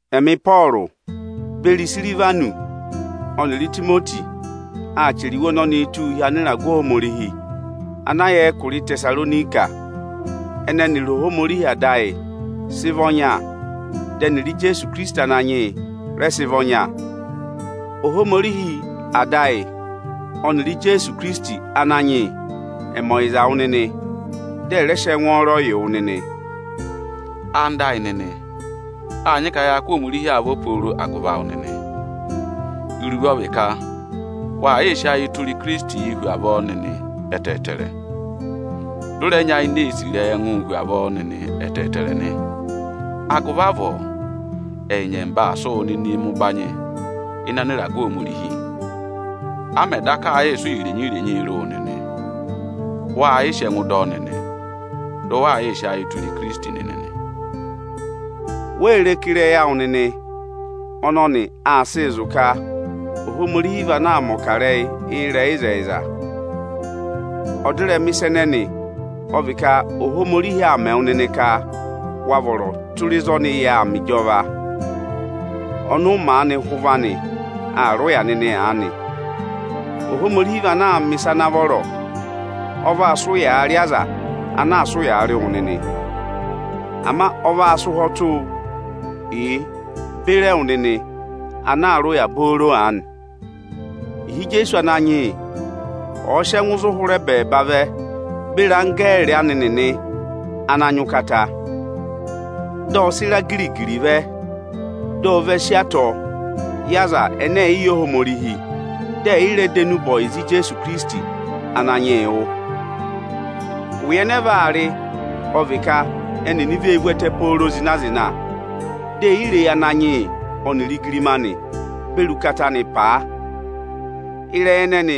Ẹmị Ịpọọrụ beri Isirivanọsị ọnịrị Itimoti aa chẹrẹ iwe ọnọnịị túu hi anịragụ Ohomorihi ana yà ẹkụra Ịtẹsaronika, ẹnẹ ẹnịrị Ohomorihi Ada ayị sị vị ọnya, dị ẹnịrị Ijeesu Ikirisiti Ananyị yị rẹ sị vị ọnya. Ohomorihi Ada ayị ọnịrị Ijeesu Ikirisiti Ananyị yị ẹ̀ mẹ ọyịza wụ nịnị, dị ẹ̀ rẹ sị ẹngwọọrọ yị wụ nịnị. Ẹwụ nịnị ẹyịnyara amị, áa nyị ka yaa kụ́ Ohomorihi avọ pooro agụvị awụ nịnị. Iruvo ọ vị ka waa yị sị ayị tụra Ikirisiti hu avọọ nịnị ẹtẹẹtẹrẹ, dị ụ rẹ nyayịnẹ ee sì ịrẹyị ẹngụụ hu avọọ ẹtẹẹtẹrẹ nị. Agụvị avọọ ẹyị nyẹmba aa sị wụ nịnịị mẹ ụbanyị ịnị anịragụ Ohomorihi nị. A mẹ̀ daka aa yịị sị ụya irenyi-irenyii rị wụ nịnị, waa yịị sị ẹngụụ dọ ọ nịnị, dị ụ waa yịị sị ayịị tụra Ikirisiti nịnị nị. Wee re ka ịrẹyị awụ nịnị ọnọnị aa sịị zụ̀ ka Ohomorihi vị anaā mẹ̀ ọkarẹyị ịrẹyịzẹyịza? Ọdịrẹma ịsa ẹnẹnị ọ vị ka Ohomorihi aa mẹ wụ nịnị ka wa vọrọ tụra ịzị ọnị yà aa mẹ ịjọva, ọnị ụ maanị hụ ụvọ anị aa rị ụya nịnị aanị nị. Ohomorihi vị anaā mẹ̀ ịsa ana vọrọ: Ọ vaa sị ụyaa rị aza ana aa sị ụyaa rị wụ nịnị. Ama ọ vaa sị ụhwọtụụ yị beri ẹwụ nịnị ana aa rị ụya booro aanị, ịhị Ijeesu Ananyị yị ọ̀ọ sị ẹngụ zụ hụrị ẹbẹẹba vẹ beri anggẹẹrị anị nịnị ana nyị ụkata. Dị ọ sị ịra giri-giri vẹ, di o ve si atọ yị aza ẹnẹ ẹ̀ yị yẹ Ohomorihi, dị ẹ̀ yị rẹ dọ enube ọyịza Ijeesu Ananyị yị wụ́. Ụya ẹnẹ ẹ vaa rị ọ vị ka ẹnịnị vee vú ẹtẹ pooro zịna-zịna, ẹnịnị e yi vee re eyi Ananyị yị ọnịrị igirima anị beri ụkata anị paa. Ịrẹyị ẹnẹẹ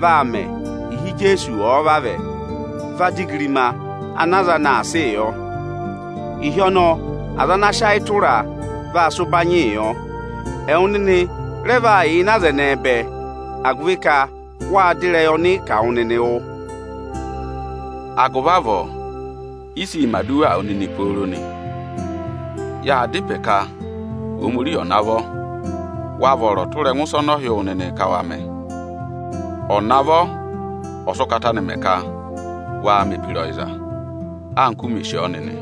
vaa mẹ ịhị Ijeesu ọ̀ọ vavẹ va dọ igirima ana aza anị aa sịị yọ. Ịhị ọnọọ aza ana sị ayị tụraa vaa sị ụbanyịị yọ. Ẹwụ nịnị rẹ vaa yà ịnị aza ẹnẹẹ bẹẹ, agụvị ka wâ dọ ịrẹyị ọnị kà wụ nịnị wụ́. Agụvị avọọ ị sịị̄ mẹ̀ aduwaa wụ nịnị pooro nị. Yaa dá ịpẹ ka Ohomorihi ọ̀ navọ wa vọrọ tụra ịsa ọnị ọ hị́ wụ nịnị ka wa mẹ: ọ̀ navọ ọ̀ sị ụkata anị mẹ ka waa mẹ̀ ebira ọyịza, anka u mè sì ọ nịnị,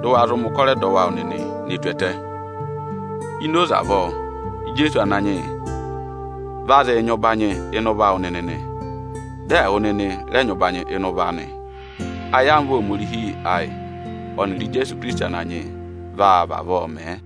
dị ụ wa zụ mẹ̀ ụkọrọ ẹdọwụ awụ nịnị ne tù ẹtẹ. Ini oze avọọ Ijeesu Ananyị yị va zụụ nyị ụbanyị ịnị ụvọ awụ nịnị nị, dị ẹwụ nịnị rẹ nyị ụbanyị ịnị ụvọ anị. Ayamva Ohomorihi ayị ọnịrị Ijeesu Ikirisiti Ananyị yị vaa vavọọ mẹẹ.